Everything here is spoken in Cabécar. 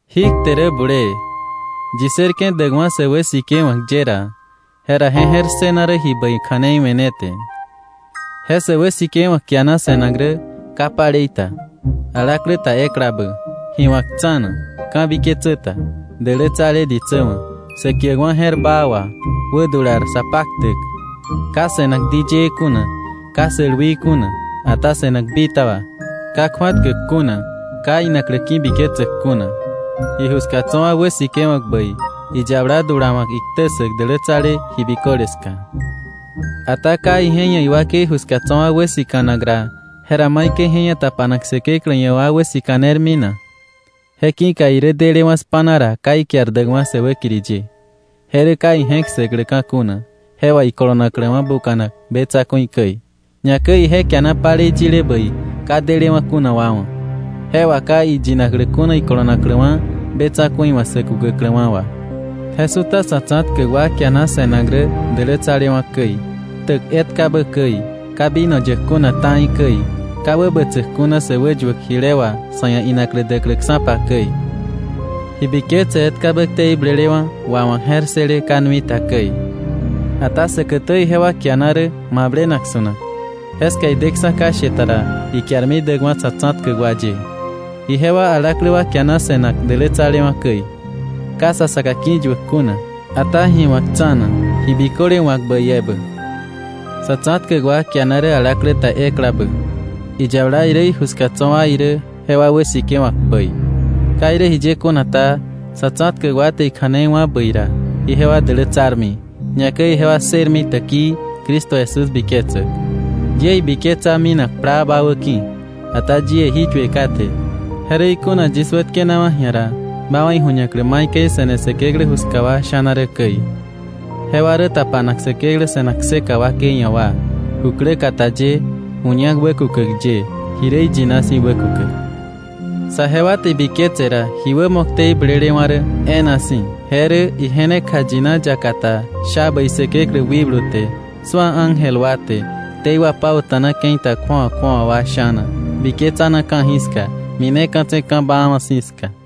Jí kte rä bulee, yi ssërke̱ däkwa̱ sä wäsikewa̱k ye ra, jera je je̱r ssëna rä ji bäi kja̱nei we̱ ne te. Je sä wäsikewa̱k kiana se̱nak rä ka palei ta, alaklä ta eklabä, ji wa̱k tsa̱na, ka̱biketsä ta, dälätsale ditsä wa̱, sä kiäkwa̱ je̱r baa wà, wädular sa paktäk, ka se̱nak diyëë kuna, ka sälwii kuna, ata se̱nak bitaba, ka kju̱atkäk kuna, ka inaklä ki̱biketsäk kuna, iju ska tso̱ wa wäsikewa̱k bäi, iyabala dulawa̱k iktä ssäk dälätsale ji biköle ska. Ata ka ije ia̱ iwakei ju ska tso̱ wa wäsika̱nak ra, ¿jera maikäi je ia̱ tapanak Säkeklä ia̱ wa wäsika̱nermi na? Je ki̱ka irä delewa̱ spa̱na ra ka ikiar däkwa̱ sä wäkiri ye, je rä ka ije̱k ssäkläka̱ kuna, je wà ikolonakläwa̱ buka̱nak be tsa̱ku̱i käi. Ñakäi ije kiana palei yile bäi ka delewa̱ kuna wa wa̱, je wà ka iyinakläka̱ kuna ikolonakläwa̱ be tsa̱ku̱i wa̱ sä kukäkläwa̱ wà. Je su̱ta sa̱ tsa̱tkäk wa kiana se̱nak rä dälätsalewa̱ käi, ktäk etkabä käi, ka vino yäk kuna ta̱i käi, ka wäbätsäk kuna sä wäyuäk jile wà sa̱ ia̱ inaklä däkläksa̱pa käi, ji biketse etkabä ktei blelewa̱ wawa̱k je̱r ssële ka nui ta käi. Ata säkätä ijewa kiana rä mablenak su̱nak. Jeska ideksa̱ ka she ta ra, ikiarmi däkwa̱ sa̱ tsa̱tkäk wa ye. Ijewa alaklä wa kiana se̱nak dälätsalewa̱ käi, ka sa saka ki̱yuäk kuna, ata ji wa̱k tsa̱na, ji biköle wa̱k bäi ebä. Sa̱ tsa̱tkäk wa kiana rä alaklä ta eklabä, iyabala irä iju ska tso̱ wa irä jewa wäsikewa̱k bäi. Ka irä jiye kuna ta, sa̱ tsa̱tkäk wa te ikja̱nei wá̱ bäi ra, ijewa dälätsarmi, ñakäi ijewa ssërmi täkii Cristo Jesús biketsäk. Yie ibiketsa minak plaa ba wäki̱. Ata yie jí yue kate, je rä ikuna yis wätkenawa̱ ji̱a ra, ba wa̱ iju̱ñaklä maikäi se̱ne Säkeklä ju ska wa sha̱na rä käi. Jewa rä tapanak Säkeklä se̱nak kseka wakei ia̱ wa, ju kläkata ye ju ñak wäkukäk ye ji rä iyina si̱ wäkukäk. Saje wa te ibiketse ra, ji wämo ktei blelewa̱ rä e̱e̱na si̱, je rä: Ije ne kjayina yaka ta, sha bäi Säkeklä wikblu te, su̱a ángel wa te, ktei wapauta̱na ke̱i ta kju̱awa kju̱awa wa sha̱na, biketsana ka̱jiska, mineka̱tse̱ ka̱ baawa̱ si̱ ska.